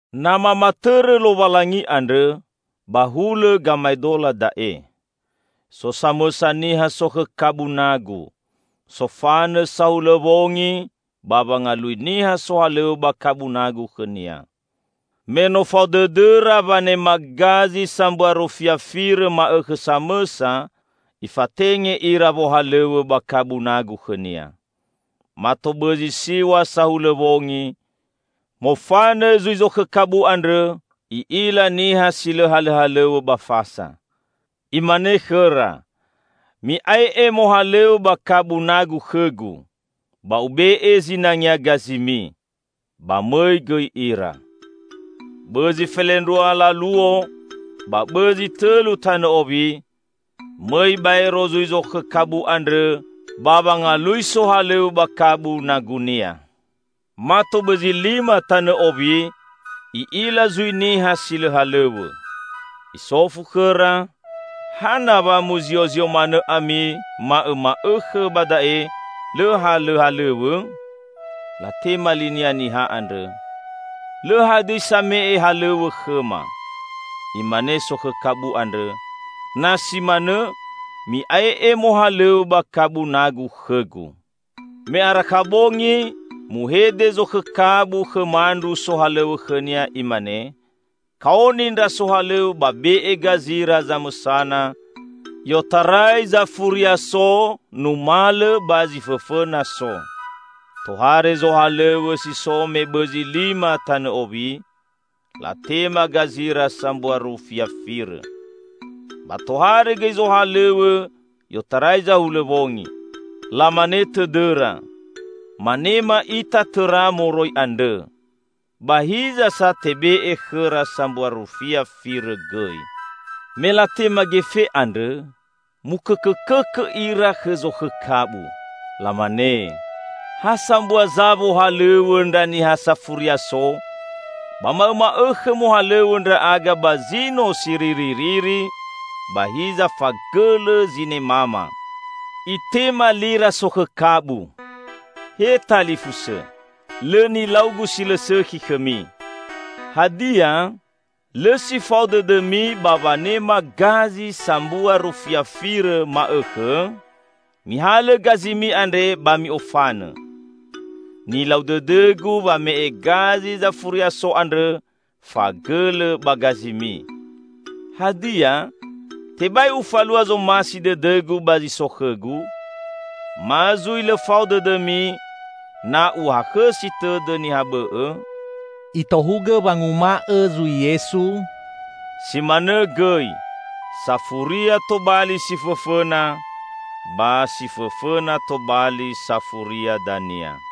"Na mamatõrõ Lowalangi andrõ, ba hulõ gamaedola da'e: So samõsa niha sokhõ kabu nagu, sofanõ sahulõ wongi ba wangalui niha sohalõw̃õ ba kabu nagu khõnia. Me no fao dõdõra wanema gazi sambua rufia firõ ma'õkhõ samõsa, ifatenge ira wohalõw̃õ ba kabu nagu khõnia. Mato bõzi siw̃a sahulõ wongi, mofanõ zui zokhõ kabu andrõ, i'ila niha si lõ halõhalõw̃õ ba fasa. Imane khõra, 'Mi'ae'e mohalõw̃õ ba kabu nagu khõgu. Ba ube'e zinangea gazimi.' Ba mõi gõi ira. Bõzi felendrua laluo ba bõzi tõlu tanõ owi, mõi baero zui zokhõ kabu andrõ ba wangalui sohalõw̃õ ba kabu nagunia. Mato bõzi lima tanõ owi, i'ila zui niha si lõ halõw̃õ. Isofu khõra, 'Hana wa muziozio manõ ami ma'õma'õkhõ ba da'e lõ halõhalõw̃õ?' Latema linia niha andrõ, 'Lõ hadõi same'e halõw̃õ khõma.' Imane sokhõ kabu andrõ, 'Na si manõ, mi'ae'e mohalõw̃õ ba kabu nagu khõgu.' Me arakha bongi, muhede zokhõ kabu khõ mandru sohalõw̃õ khõnia imane, 'Kaoni ndra sohalõw̃õ ba be'e gazira zamõsana, i'otarai zafuria so numalõ ba zi fõfõna so.' Tohare zohalõw̃õ si so me bõzi lima tanõ owi, latema gazira sambua rufia firõ. Ba tohare gõi zohalõw̃õ i'otarai zahulõ wongi. Lamane tõdõra, manema ita tõra moroi andrõ. Ba hiza sa tebe'e khõra sambua rufia firõ gõi. Me latema gefe andrõ, mukõkõkõkõ ira khõ zokhõ kabu. Lamane, 'Ha sambua za wohalõw̃õ ndra niha safuria so, ba ma'õma'õkhõ mohalõw̃õ ndra'aga ba zino siriririri, ba hiza fagõlõ zinemama.' Itema lira sokhõ kabu, 'He talifusõ, lõ nilaugu si lõ sõkhi khõmi. Hadia, lõ si fao dõdõmi ba wanema gazi sambua rufia firõ ma'õkhõ? Mihalõ gazimi andre ba mi'ofanõ. Nilau dõdõgu wame'e gazi zafuria so andrõ fagõlõ ba gazimi. Hadia, tebai ufalua zomasi dõdõgu ba zi so khõgu? Ma zui lõ fao dõdõmi, na uhakhõsi tõdõ niha bõ'õ?'" Itohugõ wanguma'õ zui Yesu, "Si manõ gõi: safuria tobali si fõfõna, ba si fõfõna tobali safuria dania."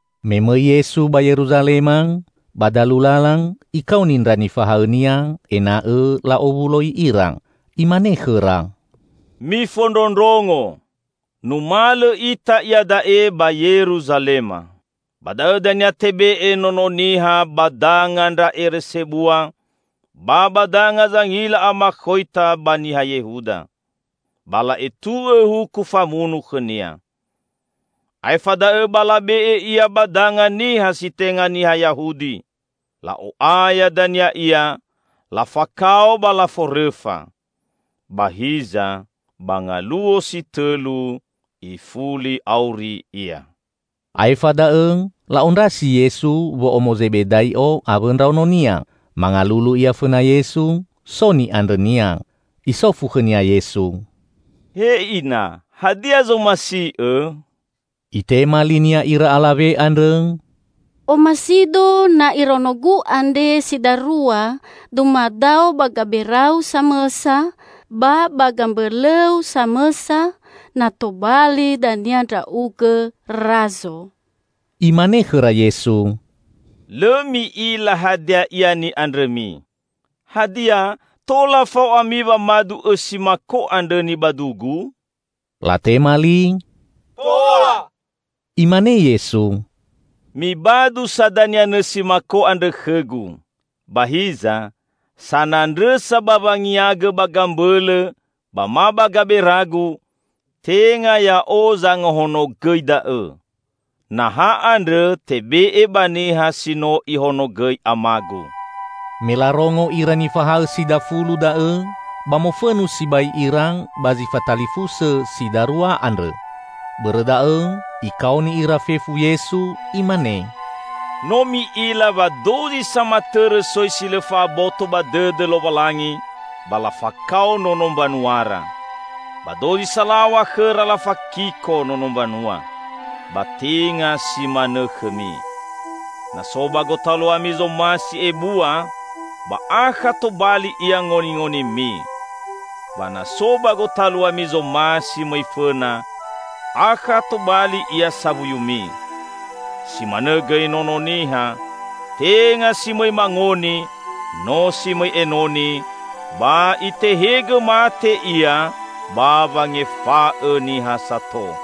Me mõi Yesu ba Yeruzalema, ba dalu lala Ikaoni ndra nifahaõ-Nia ena'õ la'owuloi ira. Imane khõra, "Mifondrondrongo! Numalõ ita iada'e ba Yeruzalema. Ba da'õ dania tebe'e Nono Niha ba danga ndra ere sebua, ba ba danga zangila amakhoita ba niha Yehuda. Ba la'etu'õ huku famunu khõ-Nia. Aefa da'õ ba labe'e Ia ba danga niha si tenga niha Yahudi. La'o'aya dania Ia, lafakao ba laforõfa. Ba hiza, ba ngaluo si tõlu ifuli auri Ia." Aefa da'õ la'ondrasi Yesu wo'omo Zebedai'o awõ ndraononia. Mangalulu ia fõna Yesu, so ni'andrõnia. Isofu khõnia Yesu, "He Ina, hadia zomasi'õ?" Itema li-Nia ira alawe andrõ, "Omasido na iraonogu andre si darua dumadao ba gabera-U samõsa ba ba gambõlõ-U samõsa na tobali dania Ndra'ugõ Razo." Imane khõra Yesu, "Lõ mi'ila hadia ia ni'andrõmi. Hadia, tola fao ami wamadu õsi mako andrõ nibadu-Gu?" Latema li, "Tola!" Imane Yesu, "Mibadu sa dania nõsi mako andrõ khõ-Gu. Ba hiza, sanandrõsa ba wangiagõ ba gambõlõ ba ma ba gabera-Gu, tenga Ya'o zangahonogõi da'õ. Naha andrõ tebe'e ba niha si no Ihonogõi Ama-Gu." Me larongo ira nifahaõ si dafulu da'õ ba mofõnu sibai ira ba zi fatalifusõ si darua andrõ. Bõrõ da'õ Ikaoni ira fefu Yesu, Imane, "No mi'ila wa dozi samatõrõ soi si lõ fa'aboto ba dõdõ Lowalangi ba lafakao nono mbanuara. Ba dozi salaw̃a khõra lafakiko nono mbanua. Ba tenga si manõ khõmi. Na so ba gotaluami zomasi ebua, ba akha tobali ia ngoningonimi. Ba na so ba gotaluami zomasi mõi fõna, akha tobali ia sawuyumi. Si manõ gõi Nono Niha, tenga si mõi mangoni, no si mõi enoni, ba Itehegõ mate Ia ba wangefa'õ niha sato."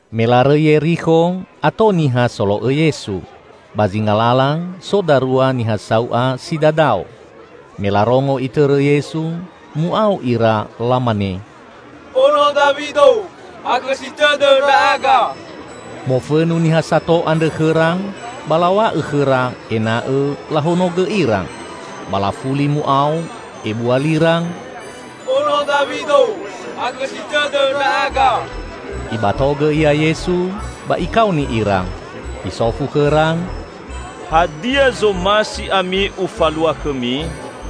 Me larõi Yerikho, ato niha solo'õ Yesu. Ba zinga lala so darua niha sau'a si dadao. Me larongo Itõrõ Yesu, mu'ao ira lamane, "Ono Dawido, hakhõsi tõdõ ndra'aga!" Mofõnu niha sato andrõ khõra ba law̃a'õ khõra ena'õ lahonogõ ira. Ba lafuli mu'ao ebua lira, "He Tuha, Ono Dawido, hakhõsi tõdõ ndra'aga!" Ibatogõ Ia Yesu ba Ikaoni ira. Isofu khõra, "Hadia zomasi ami Ufalua khõmi?"